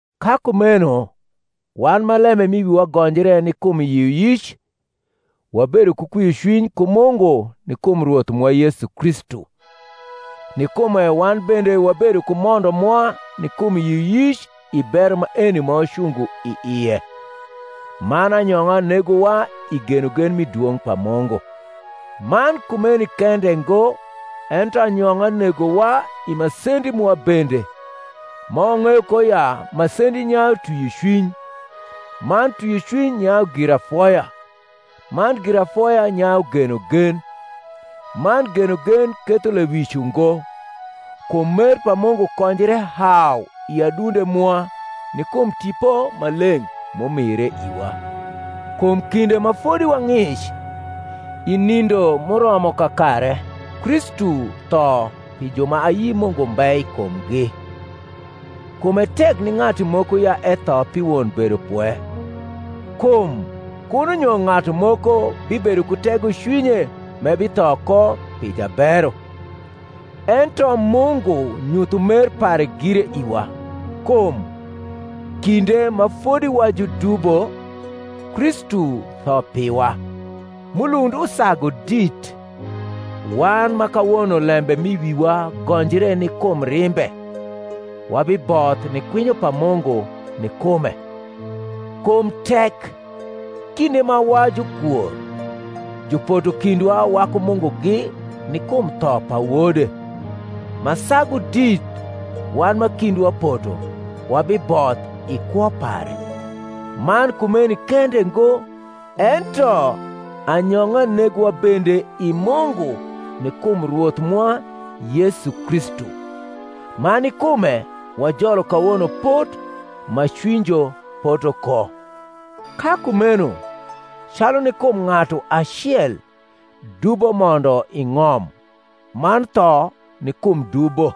Ka kumeno wan ma lembe m’i wiwa gonjre ni kum yioyic, wabedo ku kwiocwiny ku Mungu ni kum Rwoth mwa Yesu Kristu; ni kume wan bende wabedo ku mondo mwa ni kum yioyic i bero maeni ma wacungo i ie; man anyong’a negowa i genogen mi dwong’ pa Mungu. Man kumeni kende ngo ento anyong’a negowa i masendi mwa bende: ma wang’eyo ko ya masendi nyayu twiocwiny; man twiocwiny nyayu girafoya; man girafoya nyayu genogen: man genogen ketho lewic ungo; kum mer pa Mungu konjre hau i adunde mwa ni kum Tipo Maleng’ m’umire iwa. Kum kinde ma fodi wa ng’ic, i nindo m’uromo kakare Kristu tho pi ju ma ayi Mungu mbe i kumgi. Kum e tek ni ng’atu moko ya etho pi won bedopwe: kum kuno nyo ng’atu moko bibedo ku tegocwinye m’ebitho ko pi jabero: ento Mungu nyutho mer pare gire iwa, kum, kinde ma fodi wa judubo, Kristu tho piwa. M’ulund usagu dit, wan ma kawono lembe m’i wiwa gonjre ni kum rimbe, wabiboth ni kwinyo pa Mungu ni kume. Kum tek, kinde ma wa jukwor, jupoto kindwa waku Mungugi ni kum tho pa Wode, ma sagu dit, wan ma kindwa poto, wabiboth i kwo pare; man kumeni kende ngo, ento anyong’a negowa bende i Mungu ni kum Rwoth mwa Yesu Kristu, ma ni kume wajolo kawono pot ma cwinyjo poto ko. Ka kumeno, calu ni kum ng’atu acel dubo mondo i ng’om man tho ni kum dubo,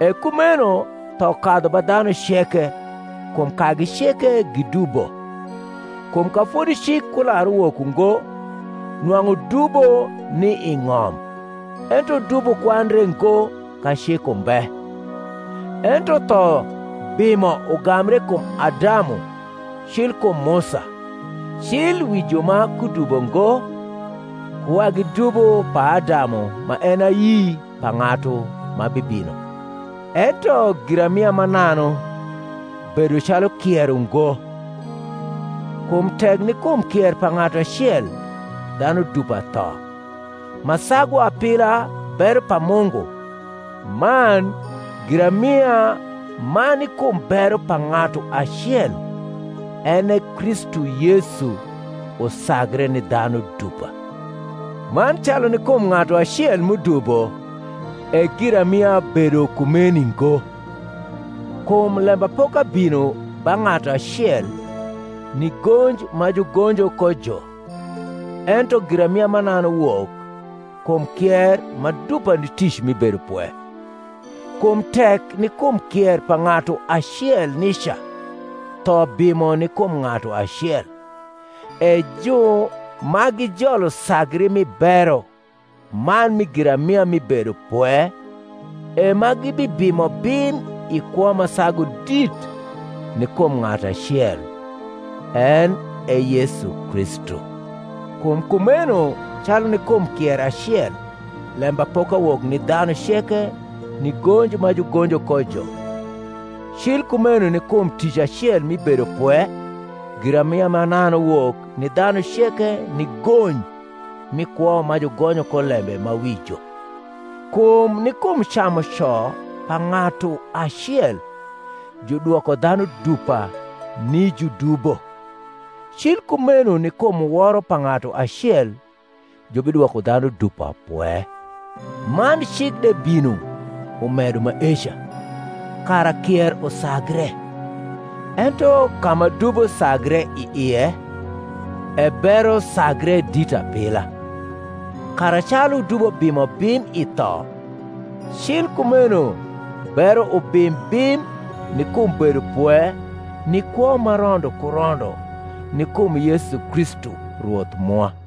e kumeno tho kadhu ba dhanu ceke, kum kagi ceke gidubo: kum ka fodi cik kular uwok ungo nwang’u dubo ni i ng’om; ento dubo kwandre ngo ka cik umbe. Ento tho bimo ugambre kum Adamu cil kum Musa, cil wi ju ma kudubo ngo ku wagi dubo p’Adamu ma en e ayi pa ng’atu ma bibino. Ento giramia mananu bedo calu kier ungo. Kum tek ni kum kier pa ng’atu acel dhanu dupa tho, ma sagu apila bero pa Mungu, man giramia ma ni kum bero pa ng’atu acel, en e Kristu Yesu, usagre ni dhanu dupa. Man calu ni kum ng’atu acel m’udubo e giramia bedo kumeni ngo: kum lembapoka bino ba ng’atu acel ni gonj ma jugonjo ko jo, ento giramia mananu wok kum kier ma dupa ni tic mi bedopwe. Kum tek, ni kum kier pa ng’atu acel nica, tho bimo ni kum ng’atu acel; e ju ma gijolo sagri mi bero man mi giramia mi bedopwe e ma gibibimo bim i kwo ma sagu dit ni kum ng’atu acel, en e Yesu Kristu. Kum kumeno calu ni kum kier acel lembapoka wok ni dhanu ceke ni gonj ma jugonjo ko jo; cil kumeno ni kum tic acel mi bedopwe giramia mananu wok ni dhanu ceke ni gony mi kwo ma jugonyo ko lembe ma wi jo. Kum ni kum camuco pa ng’atu acel judwoko dhanu dupa ni judubo, cil kumeno ni kum woro pa ng’atu acel jubidwoko dhanu dupa pwe. Man cik de bino umedo maeca, kara kier usagre; ento ka ma dubo sagre i ie, e bero sagre dit apila: kara, calu dubo bimo bim i tho, cil kumeno bero ubim bim ni kum bedopwe ni kwo ma rondo ku rondo ni kum Yesu Kristu Rwoth mwa.